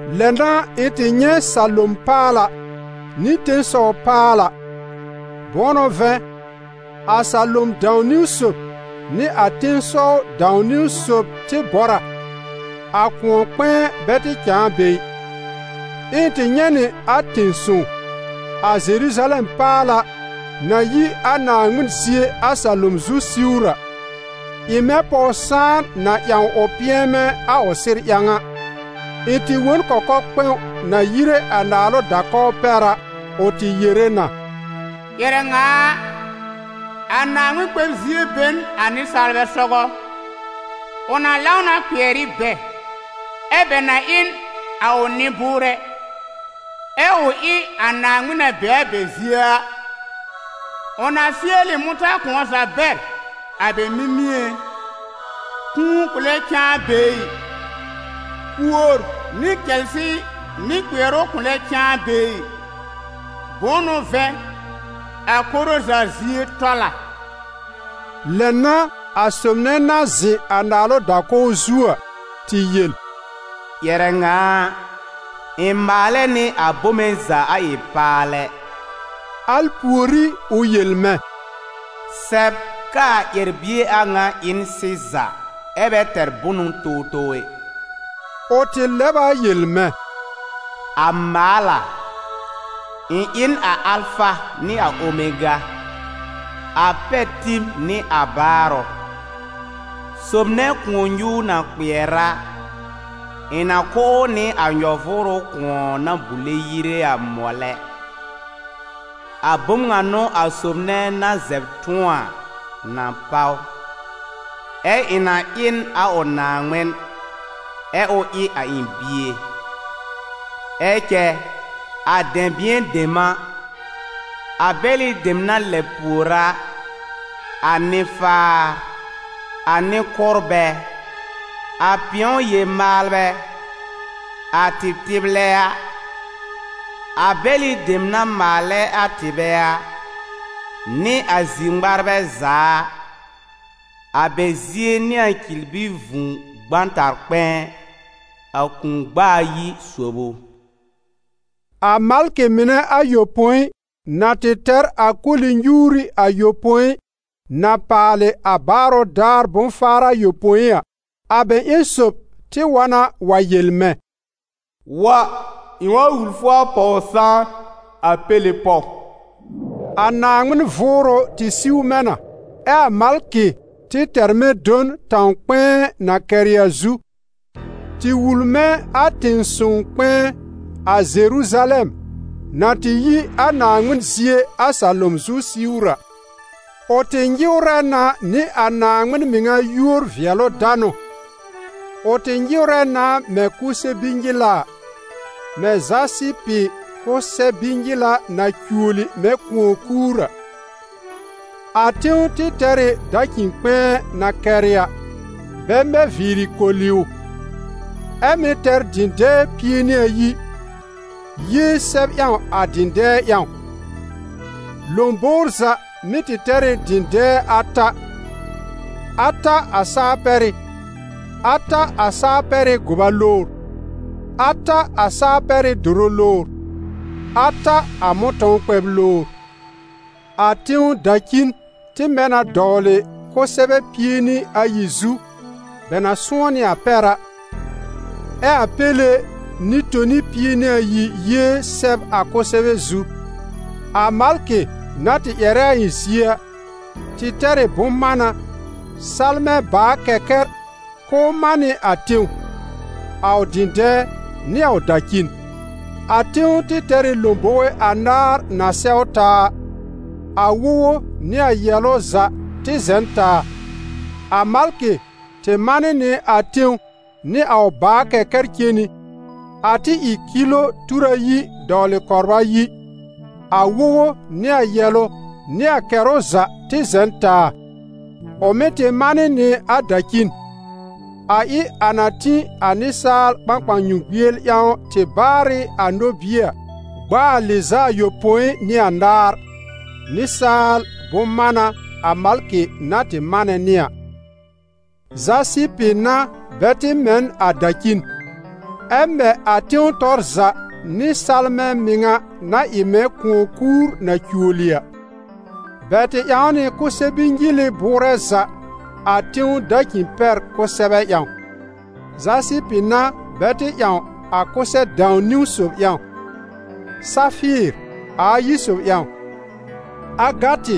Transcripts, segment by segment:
Lɛ n'a ɩ̃ tɩ nyɛ̃ salom paala nɩ tẽsɔw paala. Bʋ̃ʋ n'ʋ vɛ̃, a salom dãw-niwn sob nɩ a tẽsɔw dãw-niwn sob tɩ bɔr a, a kʋ̃ɔ-kpɛ̃ɛ bɛ tɩ cãa be ɩ. Ɛ ɩ̃ tɩ nyɛ̃ nɩ a tẽ-sõw, a Zeruzalɛm paala, na yi a Naaŋmɩn zie a salom zu siwr a, ɩ mɛ̃ pɔw-sãan na ƴãw ʋ pɩ̃ɛmɛ a ʋ sɩr ƴãw a. Ɩ̃ tɩ wõ n kɔkɔ-kpɛ̃w na yire a naalʋ da-kɔw pɛr a, ʋ tɩ yere na: «Ƴɛrɛ ŋa a, a Naaŋmɩn kpɛb-zie be n a nɩsaalbɛ sɔgɔ. Ʋ na lãw na kpɩɛr ɩ bɛ, ɛ bɛ na ɩ n a ʋ nɩ-bʋʋrɛ, ɛ ʋ ɩ a Naaŋmɩn na be a bɛ zie a. Ʋ na fɩɛl ɩ mʋ̃tã-kʋ̃ɔ za bɛr a bɛ mimĩé. Kũu kʋ̃ lɛ cãa be ɩ, kuor nɩ cɛlsɩ nɩ kpɩɛrʋ kʋ̃ lɛ cãa be ɩ. Bʋ̃ʋ n'ʋ vɛ̃, a koro za zie tɔl a.» Lɛ n'a a sob nɛ na zɩ̃ a naalʋ da-kɔw zu a, tɩ yel: «Ƴɛrɛ ŋa a, ɩ̃ maalɛ nɩ a bome za a ɩ paalɛ.» Al pùorí ʋ yel mɛ̃: «Sɛb k'aa ƴɛr-bie a ŋa ɩ n sɩza ɛ bɛ tɛr bʋnʋ towtow ɛ.» Ʋ tɩ lɛb a yel mɛ̃: «A maal a! Ɩ̃ ɩ n a Alfa nɩ a Omega, a pɛr-tib nɩ a baarʋ. Sob nɛ kʋ̃ɔ-nyuur na kpɩɛr a, ɩ̃ na kʋ̀ ʋ nɩ a nyɔ-vʋʋrʋ kʋ̃ɔ na bule yire a, mɔlɛ. A bom ŋa n'ʋ a sob nɛ na zɛb tʋ̃ɔ a na páw, ɛ ɩ̃ na ɩ n a ʋ Naaŋmɩn, ɛ ʋ ɩ a ɩ̃ bie. Ɛ cɛ, a dɛ̃bɩ̃ɛ dem a, a bɛlɩ dem na lɛb pùor a, a nɩ-faar, a nɩ-kʋ́rbɛ, a pɩ̃ɔ-yel-maalbɛ, a tɩtɩlbɛ a, a bɛlɩ dem na maalɛ a tɩbɛ a, nɩ a zir-ŋmarbɛ za a, a bɛ zie n'ɩ a cirbi vũu gbãtar-kpɛ̃ɛ: a kũu-gb'a ayi sob ʋ.» A malkɩ mɩnɛ ayopõi na tɩ tɛr a koli-nyuuri ayopõi na paalɩ a baarʋ daar bʋ̃-faar ayopõi a, a bɛ ƴẽn sob tɩ wa na wa yel mɛ̃: «Wa, ɩ̃ wa wul fʋ a pɔw-sãan, a Péle pɔw.» A Naaŋmɩn Vʋʋrʋ tɩ siw mɛ̃ na, ɛ a malkɩ tɩ tɛr mɛ̃ do n tãw-kpɛ̃ɛ na kɛrɩ a zu, tɩ wul mɛ̃ a tẽ-sõw-kpɛ̃ɛ, a Zeruzalɛm, na tɩ yi a Naaŋmɩn zie a salom zu siwr a. Ʋ tɩ nyɩwrɛ na nɩ a Naaŋmɩn mɩŋa yúor-vɩɛlʋ-danʋ, ʋ tɩ nyɩwrɛ na mɛ̃ kʋsɛ-bi-nyɩla a, mɛ̃ zasɩpɩ kʋsɛ-bi-nyɩla na cuoli mɛ̃ kʋ̃ɔ-kuur a. A tẽw tɩ tɛr ɩ dacĩ-kpɛ̃ɛ na kɛrɩ a, bɛ mɛ viiri koli ʋ, ɛ mɩ̀ tɛr dɩ̃dɛɛ pie nɩ ayi, yée sɛb ƴãw a dɩ̃dɛɛ ƴãw. Lõbowr za mɩ́ tɩ tɛr ɩ dɩ̃dɛɛ ata: ata a saa-pɛrɩ, ata a saa-pɛrɩ́ gʋba lowr, ata a saa-pɛrɩ́ dʋrʋ lowr, ata a mʋ̃tɔ̃w kpɛb lowr. A tẽw dacin tɩ mɛ na dɔwlɩ kʋsɛbɛ pie nɩ ayi zu, bɛ na sʋ̃ɔ́ nɩ a pɛr a, ɛ a Péle nɩ-toni pie nɩ ayi yée sɛb a kʋsɛbɛ zu. A malkɩ na tɩ ƴɛrɛ a ɩ̃ zie a, tɩ tɛr ɩ bʋ̃-mána, salmɛ̃ bàa-kɛkɛr, k'ʋʋ man nɩ a tẽw, a ʋ dɩ̃dɛɛ nɩ a ʋ dacin. A tẽw tɩ tɛr ɩ lõbowe anaar na sɛw taa a: a wogo nɩ a yɛ̀lʋ za tɩ zɛ̃ n taa. A malkɩ tɩ manɩ nɩ a tẽw nɩ a ʋ bàa-kɛkɛr cen nɩ, a tɩ ɩ kilo tur ayi dɔwlɩ kɔbr ayi: a wogo nɩ a yɛ̀lʋ nɩ a kɛrʋ za tɩ zɛ̃ n taa. Ʋ mɩ̀ tɩ manɩ nɩ a dacin, a ɩ a na tĩ a nɩsaal kpãkpãnyũgbiel ƴãw tɩ baarɩ a nobie a, gb'a a lɩz'a ayopõi nɩ anaar, nɩsaal bʋ̃-mána a malkɩ na tɩ manɛ nɩ a. Zasɩpɩ n'a bɛ tɩ mɛ n a dacin, ɛ mɛ a tẽw tɔr za nɩ salmɛ̃ mɩŋa na ɩ mɛ̃ kʋ̃ɔ-kuur na cuoli a. Bɛ tɩ ƴãw nɩ kʋsɛ-bi-nyɩlɩ bʋʋrɛ za a tẽw dacin-pɛr kʋsɛbɛ ƴãw: zasɩpɩ n'a bɛ tɩ ƴãw a kʋsɛ-dãw-niwn sob ƴãw, safɩɩr, a ayi sob ƴãw, agatɩ,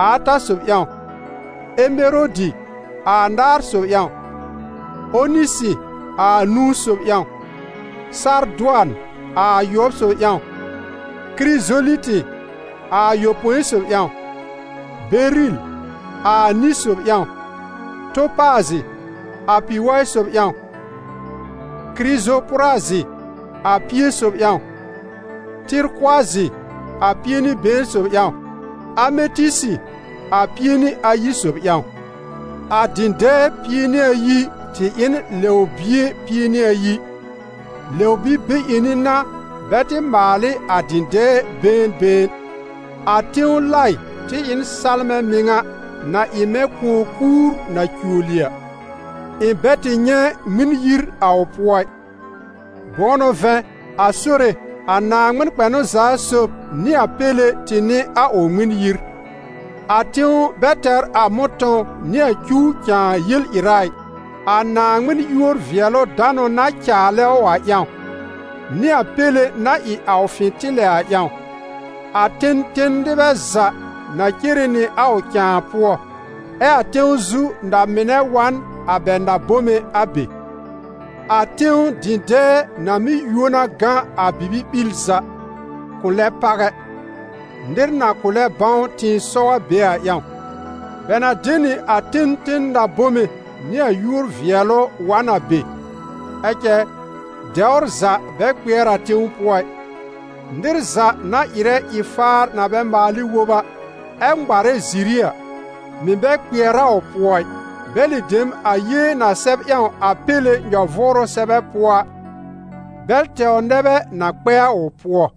a ata sob ƴãw, emerodi, a anaar sob ƴãw, onisɩ, a anũu sob ƴãw, sardʋan, a ayʋɔb sob ƴãw, kirizolitɩ, a ayopõi sob ƴãw, beril, a ani sob ƴãw, topaazɩ, a pi-waɩ sob ƴãw, kirizopʋrazɩ, a pie sob ƴãw, tɩrkʋazɩ, a pie nɩ been sob ƴãw, ametɩsɩ, a pie nɩ ayi sob ƴãw. A dɩ̃dɛɛ pie nɩ ayi tɩ ɩ n lɛw-bie pie nɩ ayi; lɛw-bi-be-ƴẽni n'a bɛ tɩ maal ɩ a dɩ̃dɛɛ been been. A tẽw laɩ tɩ ɩ n salmɛ̃ mɩŋa na ɩ mɛ̃ kʋ̃ɔ-kuur na cuoli a. Ɩ̃ bɛ tɩ nyɛ̃ Ŋmɩn-yir a ʋ pʋɔ ɩ, bʋ̃ʋ n'ʋ vɛ̃, a Sore, a Naaŋmɩn kpɛnʋ-za-sob nɩ a Péle tɩ n'ɩ a ʋ Ŋmɩn-yir. A tẽw bɛ tɛr a mʋ̃tɔ̃w nɩ a cuw cãa yel-ɩra ɩ, a Naaŋmɩn yúor-vɩɛlʋ-danʋ na caalɛ a ʋ ƴãw, nɩ a Péle na ɩ a ʋ fɩ̃tɩlɛ a ƴãw. A ten ten nɩbɛ za na cere nɩ a ʋ cãa pʋɔ, ɛ a tẽw zu na-mɩnɛ wa n a bɛ na-bome a be. A tẽw dɩ̃dɛɛ na mɩ́ yuo na gã a bibi-ɓil za, kʋ̃ lɛ pàw ɛ, nɩr na kʋ̃ lɛ bãw tɩ̃ɩsɔw a be a ƴãw. Bɛ na de nɩ a ten ten na-bome nɩ a yúor-vɩɛlʋ wa n a be. Ɛ cɛ, dɛwr za bɛ kpɩɛr a tẽw pʋɔ ɩ, nɩr za na ɩrɛ ɩ-faar na bɛ maal ɩ wob a, ɛ ŋmarɛ ziri a, mɩ̀ bɛ kpɩɛr a ʋ pʋɔ ɩ. Bɛlɩ dem a yée na sɛb ƴãw a Péle nyɔ-vʋʋrʋ sɛbɛ pʋɔ a, bɛl tɛwr nɛ bɛ na kpɛ a ʋ pʋɔ.